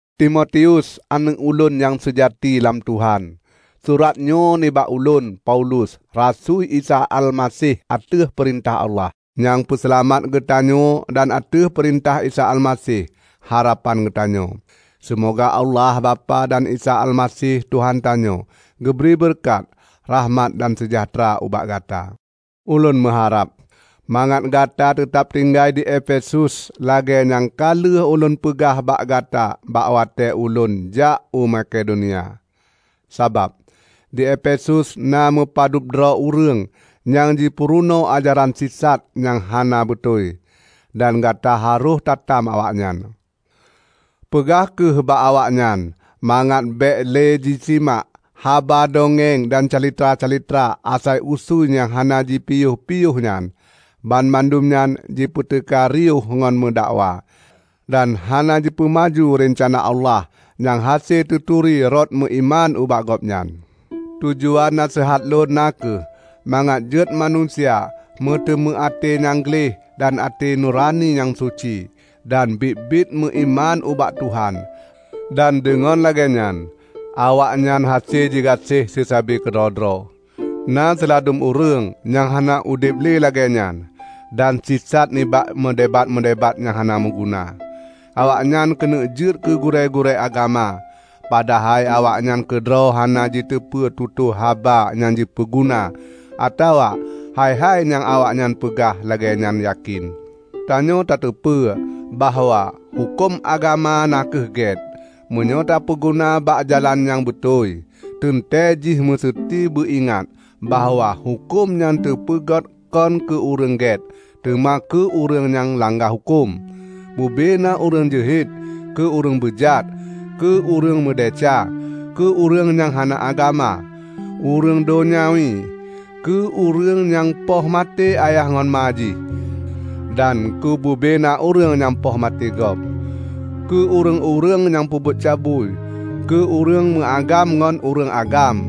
Timotius aneuëk ulôn nyang seujati lam Tuhan! Suratnyoe nibak ulôn, Paulus, rasui Isa Almaseh ateueh peurintah Allah, nyang peuseulamat geutanyoe dan ateueh peurintah Isa Almaseh, harapan geutanyoe. Seumoga Allah Bapak dan Isa Almaseh Tuhan tanyoe geubri beureukat, rahmat dan seujahteura ubak gata. Ulôn meuharab mangat gata teutab tinggai di Efesus lagée nyang ka lheueh ulôn peugah bak gata bak watée ulôn jak u Makedonia. Sabab, di Efesus na meupadub droe ureuëng nyang jipeurunoe ajaran sisat nyang hana beutôi, dan gata harôh tatam awaknyan. Peugah kheueh bak awaknyan mangat bék lé jisimak haba dongeng dan calitra-calitra asai usui nyang hana jipiôh-piôh nyan. Banmandum nyan jipeuteuka riôh ngon meudakwa, dan hana jipeumaju reuncana Allah nyang hase teuturi rot meuiman ubak Gobnyan. Tujuan naseuhat lôn na kheueh mangat jeuet manusia meuteumé até nyang gleh dan até nurani nyang suci, dan biet-biet meuiman ubak Tuhan, dan deungon lagée nyan awaknyan hase jigaséh seusabe keudroe-droe. Na siladum ureuëng nyang hana udeb lé lagée nyan, dan sisat nibak meudebat-meudebat nyang hana meuguna. Awaknyan keuneuk jeuet keugurée-gurée agama, padahai awaknyan keudroe hana jiteupeu tutoe haba nyang jipeuguna atawa hai-hai nyang awaknyan peugah lagée nyan yakén. Tanyoe tateupeue bahwa huköm agama na kheueh gét, meunyoe teupeuguna bak jalan nyang beutôi. Teuntée jih meuseuti beuingat bahwa huköm nyan teupeugét kon keu ureuëng gét, teuma keu ureuëng nyang langga huköm, bubena ureuëng jeuhet, keu ureuëng beujat, keu ureuëng meudesya, keu ureuëng nyang hana agama, ureuëng donyawi, keu ureuëng nyang poh maté ayah ngon ma jih, dan keubuna ureuëng nyang poh maté gob, keu ureuëng-ureuëng nyang peubuet cabui, keu ureuëng meuagam ngon ureuëng agam,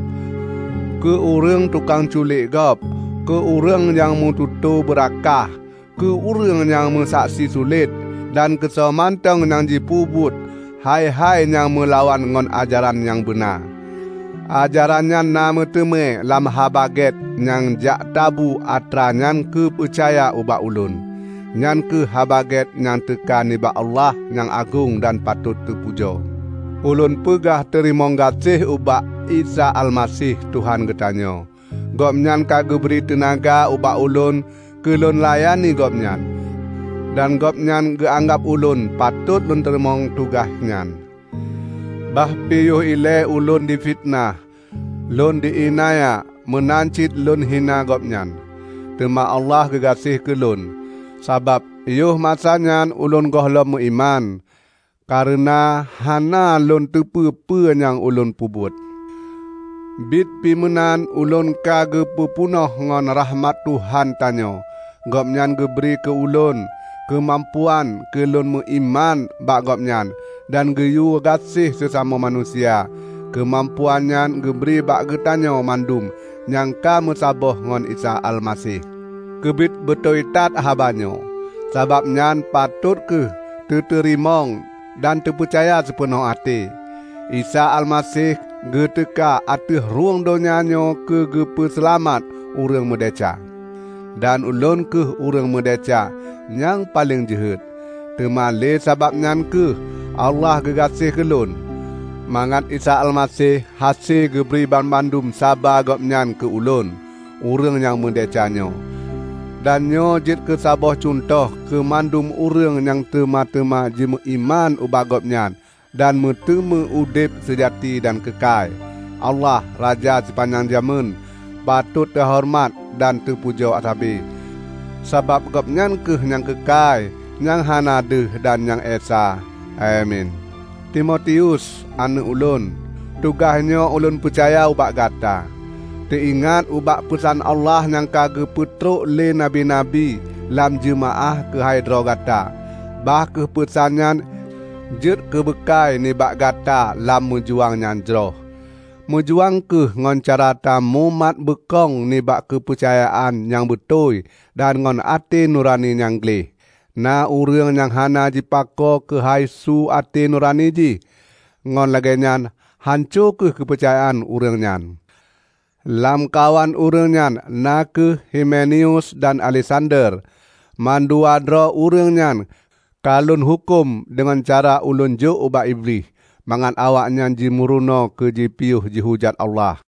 keu ureuëng tukang culek gob, keu ureuëng nyang meututoe beurakah; keu ureuëng nyang meusaksi sulet, dan keusoe mantong nyang jipeubuet hai-hai nyang meulawan ngon ajaran nyang beuna. Ajaran nyan na meuteumé lam Haba Gét nyang jaktabu atra nyan geupeucaya ubak ulôn, nyan kheueh Haba Gét nyang teuka nibak Allah nyang agong dan patot teupujoe. Ulôn peugah teurimong gaséh ubak Isa Almaseh Tuhan geutanyoe. Gobnyan ka geubri teunaga ubak ulôn keulôn layani Gobnyan, dan Gobnyan geuanggab ulôn patot lôn teurimong tugaih nyan, bah pi yoh ilée ulôn fiteunah lôn iénanya meunan cit lôn hina Gobnyan. Teuma Allah geugaséh keulôn, sabab yoh masanyan ulôn gohlom meuiman, kareuna hana lôn teupeue peue nyang ulôn peubuet. Biet pi meunan ulôn ka geupeu peunoh ngon rakhmat Tuhan tanyoe. Gobnyan geubri keu ulôn keumampuan keu lôn meuiman bak Gobnyan dan geuyue gaséh seusamoe manusia. Keumampuan nyan geubri bak geutanyoe mandum nyang ka meusaboh ngon Isa Almaseh. Keubiet beutôi that haba nyoe -- sabab nyan patot kheueh teuteurimong dan teupeucaya sipeunoh até --: "Isa Almaseh geuteuka ateueh rhueng donya nyoe keu geupeu seulamat ureuëng meudesya." Dan ulôn kheueh ureuëng meudesya nyang paleng jeuhet. Teuma lé sabab nyan kheueh Allah geugaséh ulôn, mangat Isa Almaseh hase geubri banmandum saba Gobnyan keu ulôn, ureuëng nyang meudesya nyoe. Dan nyoe jeuet keusaboh cuntoh keumandum ureuëng nyang teuma-teuma jimeuiman ubak Gobnyan dan meuteumé udeb seujati dan keukai. Allah, Raja sipanyang jamén, patot teuhoreumat dan teupujoe sabe, sabab Gobnyan kheueh nyang keukai, nyang hana deuh dan nyang esa! Amin. Timotius, aneuëk ulôn! Tugaihnyoe ulôn peucaya ubak gata, teuingat ubak peusan Allah nyang ka geupeutrok lé nabi-nabi lam jeumaáh keuhai droe gata. Bah kheueh peusan nyan jeuet keubeukai nibak gata lam meujuang nyang jroh. Meujuang kheueh ngon cara tamumat beukong nibak keupeucayaan nyang beutôi dan ngon até nurani nyang gleh. Na ureuëng nyang hana jipako keuhai su até nurani jih, ngon lagée nyan hanco kheueh keupeucayaan ureuëng nyan. Lamkawan ureuëng nyan na kheueh Himeneus dan Aleksander. Mandua droe ureuëng nyan ka lôn huköm deungon cara ulôn jok ubak Iblih, mangat awaknyan jimeurunoe keujipiôh jihujat Allah.